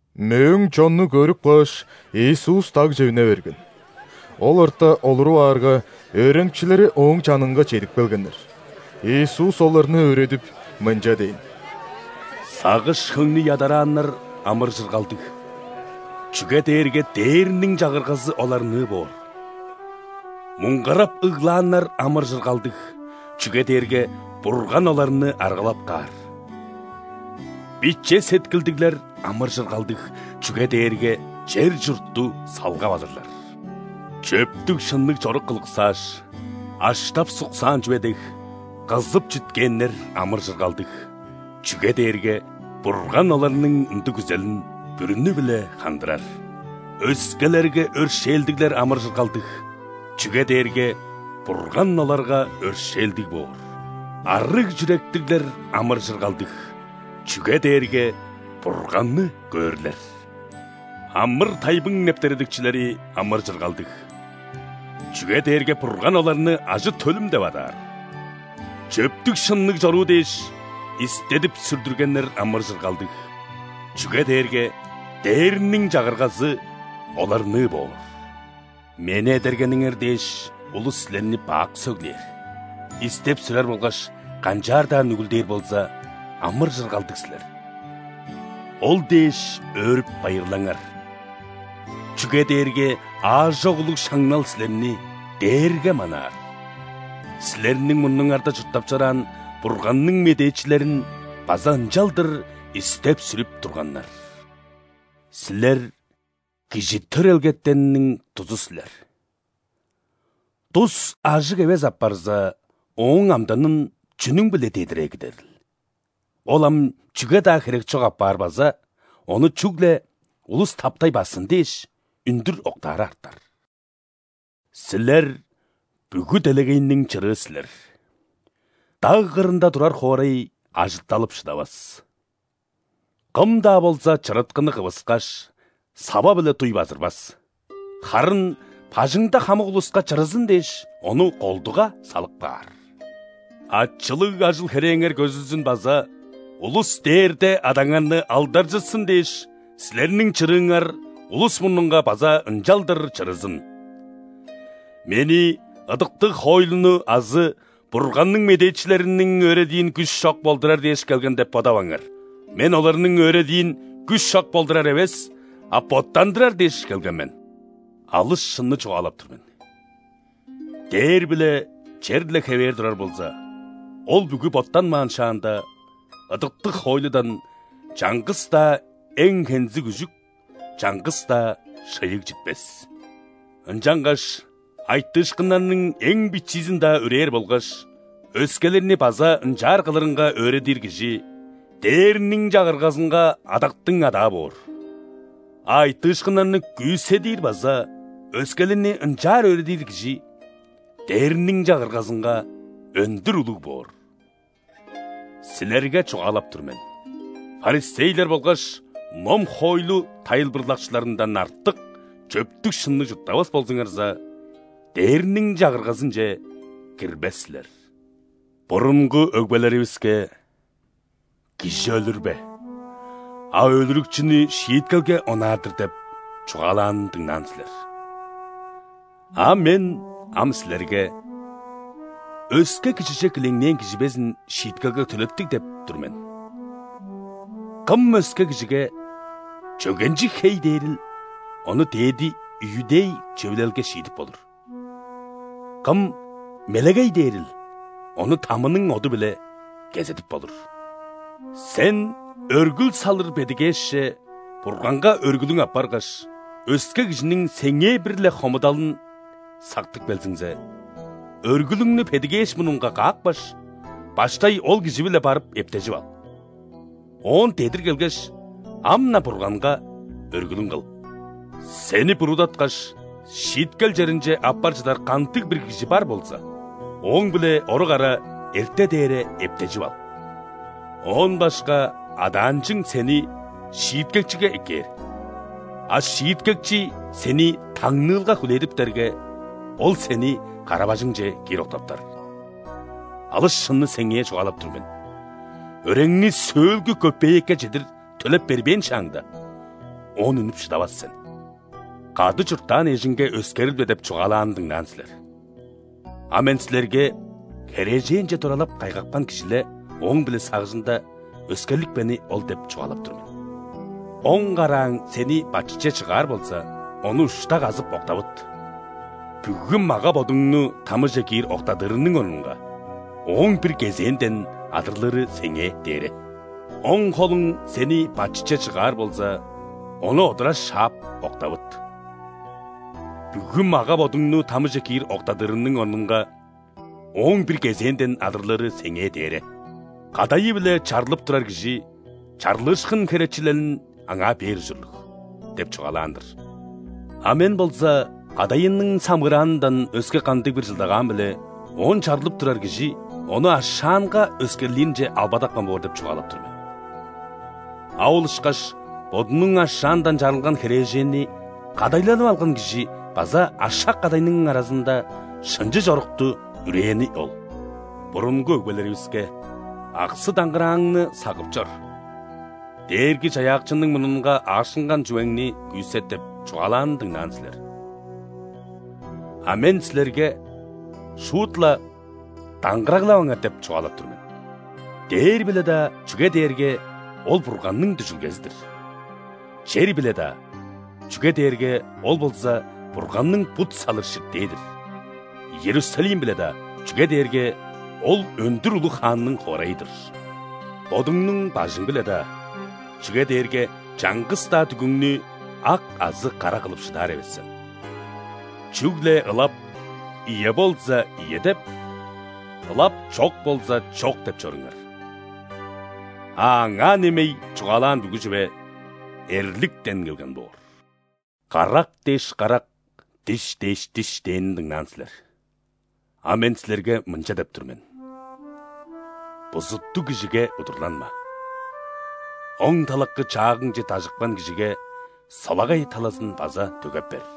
Мөөң чонну көрүп кааш, Иисус дагже үне берген. Ол орта олуруп аарга, өөреникчилери Ооң чанынга чедип келгеннер. Иисус оларны өөредип, мынча дээн: «Сагыш-хөңнү ядарааннар амыр-чыргалдыг, чүге дээрге Дээрниң Чагыргазы оларныы боор. Муңгарап ыглааннар амыр-чыргалдыг, чүге дээрге Бурган оларны аргалап каар. Биче сеткилдиглер амыр-чыргалдыг, чүге дээрге чер-чуртту салгап алырлар. Чөптүг-шынныг чорук кылыксааш, аштап-суксаан чүве дег, кызып чүткээннер амыр-чыргалдыг, чүге дээрге Бурган оларның ындыг күзелин бүрүнү-биле хандырар. Өскелерге өршээлдиглер амыр-чыргалдыг, чүге дээрге Бурган оларга өршээлдиг боор. Арыг чүректиглер амыр-чыргалдыг, чүге дээрге Бурганны көөрлер. Амыр-тайбың нептередикчилери амыр-чыргалдыг, чүге дээрге Бурган оларны ажы-төлүм деп адаар. Чөптүг-шынныг чоруу дээш, истедип-сүрдүргеннер амыр-чыргалдыг, чүге дээрге Дээрниң Чагыргазы оларныы боор. Мени эдергениңер дээш, улус силерни бак сөглээр, истеп-сүрер болгаш канчаар-даа нүгүлдээр болза, амыр-чыргалдыг силер. Ол дээш өөрүп-байырлаңар! Чүге дээрге аажок улуг шаңнал силерни дээрге манаар. Силерниң мурнуңарда чурттап чораан Бурганның медээчилерин база ынчалдыр истеп-сүрүп турганнар». «Силер – кижи төрелгетенниң дузу силер. Дус ажыг эвес апарза, ооң амданын чүнүң-биле дедир эгидерил? Ол ам чүге-даа херек чок апаар база ону чүгле улус таптай бассын дээш, үндүр октаары артар. Силер – бүгү делегейниң чырыы силер. Даг кырында турар хоорай ажытталып шыдавас. Кым-даа болза чырыткыны кывыскаш, сава-биле дуй базырбас, харын бажыңда хамык улуска чырызын дээш, ону колдуга салып каар. Ачылыг ажыл-херээңер көзүлзүн база улус Дээрде Адаңарны алдаржытсын дээш, силерниң чырыыңар улус мурнунга база ынчалдыр чырызын». «Мени ыдыктыг хоойлуну азы Бурганның медээчилериниң өөредиин күш чок болдурар дээш келген деп бодаваңар. Мен оларның өөредиин күш чок болдурар эвес, а боттандырар дээш келген мен! Алыс шынны чугаалап тур мен: дээр биле чер-ле хевээр турар болза, ол бүгү боттанмаан шаанда, ыдыктыг хоойлудан чаңгыс-даа эң хензиг үжүк, чаңгыс-даа шыйыг читпес. Ынчангаш айтыышкыннарның эң бичиизин-даа үрээр болгаш өскелерни база ынчаар кылырынга өөредир кижи Дээрниң Чагыргазынга адактың адаа боор. А айтыышкыннарны күүседир база өскелерни ынчаар өөредир кижи Дээрниң Чагыргазынга өндүр улуг боор. Силерге чугаалап тур мен: ·фарисейлер болгаш ном-хоойлу тайылбырлакчыларындан артык чөптүг-шынныг чурттавас болзуңарза, Дээрниң Чагыргазынче кирбес силер». «Бурунгу өгбелеривиске: „Кижи өлүрбе! А өлүрүкчүнү шииткелге онаар-дыр“ – деп чугаалаанын дыңнаан силер. А Мен ам силерге: „Өске кижиже килеңнээн кижи безин шииткелге төлептиг“ – деп тур мен. Кым өске кижиге: „Чөгенчиг хей!“ – дээрил, ону ·дээди иудей Чөвүлелге шиидип болур. Кым: „Мелегей!“ – дээрил, ону ·тамының оду-биле кезедип болур. Сен өргүл салыр бедигээшче Бурганга өргүлүң аппаргаш, өске кижиниң сеңээ бир-ле хомудалын сактып келзиңзе, өргүлүңнү бедигээш мурнунга каапкаш, баштай ол кижи-биле барып эптежип ал. Оон дедир келгеш, ам-на Бурганга өргүлүң кыл. Сени буруудаткаш, шииткел черинче аппар чыдар кандыг-бир кижи бар болза, ооң-биле орук ара эрте дээре эптежип ал. Оон башка адаанчың сени шииткекчиге эккээр, а шииткекчи сени таңныылга хүлээдиптерге, ол сени кара-бажыңче киир октаптар. Алыс шынны сеңээ чугаалап тур мен: өреңни сөөлгү көпеекке чедир төлеп бербээн шааңда, оон үнүп шыдавас сен». «„Кады чурттаан эжиңге өскерилбе“ – деп чугаалаанын дыңнаан силер. А Мен силерге херээженче туралап кайгапкан кижи-ле ооң-биле сагыжында өскерлипкени ол деп чугаалап тур мен. Оң карааң сени бачытче чыгаар болза, ону ушта казып, октавыт! Бүгү мага-бодуңну ·тамыже киир октадырының орнунга, ооң бир кезээнден адырлыры сеңээ дээре. Оң холуң сени бачытче чыгаар болза, ону одура шаап, октавыт! Бүгү мага-бодуңну тамыже киир октадырының орнунга, ооң бир кезээнден адырлыры сеңээ дээре». «„Кадайы-биле чарлып турар кижи чарлыышкын херечилелин аңаа бээр ужурлуг“ – деп чугаалаан-дыр. А Мен болза кадайының самыыраанындан өске кандыг-бир чылдагаан-биле оон чарлып турар кижи ону ашаанга өскерлиринче албадапкан боор деп чугаалап тур мен. А ол ышкаш бодунуң ашаандан чарылган херээженни кадайланып алган кижи база ашак-кадайның аразында шынчы чорукту үрээни ол». «Бурунгу өгбелеривиске: „Аксы-даңгырааңны сагып чор. Дээрги-Чаяакчының мурнунга аашкынган чүвеңни күүсет“ – деп чугаалаанын дыңнаан силер. А Мен силерге шуут-ла даңгыраглаваңар деп чугаалап тур мен: дээр-биле-даа, чүге дээрге ол Бурганның дүжүлгези-дир; чер-биле-даа, чүге дээрге ол болза Бурганның бут салыр ширтээ-дир; Иерусалим-биле-даа, чүге дээрге ол өндүр улуг Хаанның хоорайы-дыр; бодуңнуң бажың-биле-даа, чүге дээрге чаңгыс-даа дүгүңнү ак азы кара кылып шыдаар эвес сен. Чүгле ылап „ийе“ болза, „ийе“ деп, ылап „чок“ болза, „чок“ деп чоруңар. А аңаа немей чугаалаан бүгү чүве – эрликтен келген боор». «„Карак дээш карак, диш дээш диш“ – дээнин дыңнаан силер. А Мен силерге мынча деп тур мен: бузуттуг кижиге удурланма. Оң талакы чаагыңче дажыпкан кижиге солагай талазын база дөгеп бер.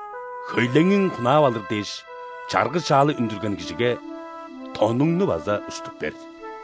Хөйлеңиң хунаап алыр дээш, чаргы-чаалы үндүрген кижиге тонуңну база уштуп бер.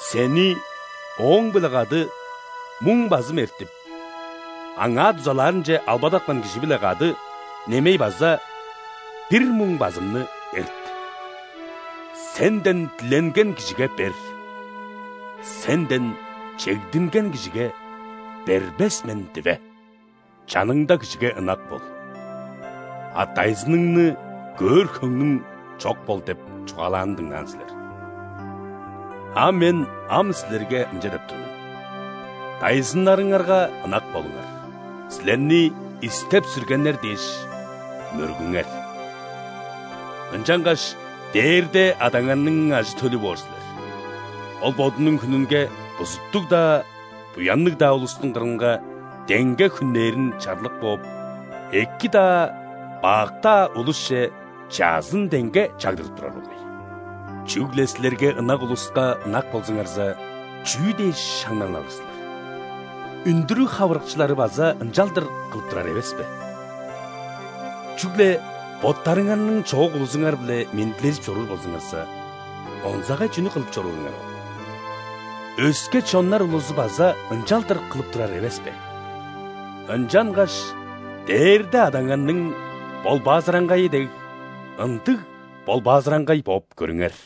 Сени ооң-биле кады муң базым эртип, аңаа дузалаарынче албадапкан кижи-биле кады немей база бир муң базымны эрт. Сенден диленген кижиге бер, сенден чегдинген кижиге бербес мен диве. „Чаныңда кижиге ынак бол, а дайзыныңны көөр хөңнүң чок бол“ – деп чугаалаанын дыңнаан силер. А Мен ам силерге мынча деп тур мен: дайзыннарыңарга ынак болуңар, силерни истеп-сүргеннер дээш, мөргүңер. Ынчангаш Дээрде Адаңарның ажы-төлү боор силер. Ол Бодунуң хүнүнге бузуттуг-даа, буянныг-даа улустуң кырынга деңге хүннээрин чарлык бооп, эки-даа, бак-даа улусче чаъзын деңге чагдырып турар болгай. Чүгле силерге ынак улуска ынак болзуңарза, чүү дээш шаңнал алыр силер? Үндүрүг хавырыкчылары база ынчалдыр кылып турар эвес бе? Чүгле боттарыңарның чоок улузуңар-биле мендилежип чоруур болзуңарза, онзагай чүнү кылып чорууруңар ол? Өске чоннар улузу база ынчалдыр кылып турар эвес бе? Ынчангаш Дээрде Адаңарның ·болбаазыраңгайы дег, ындыг болбаазыраңгай бооп көрүңер».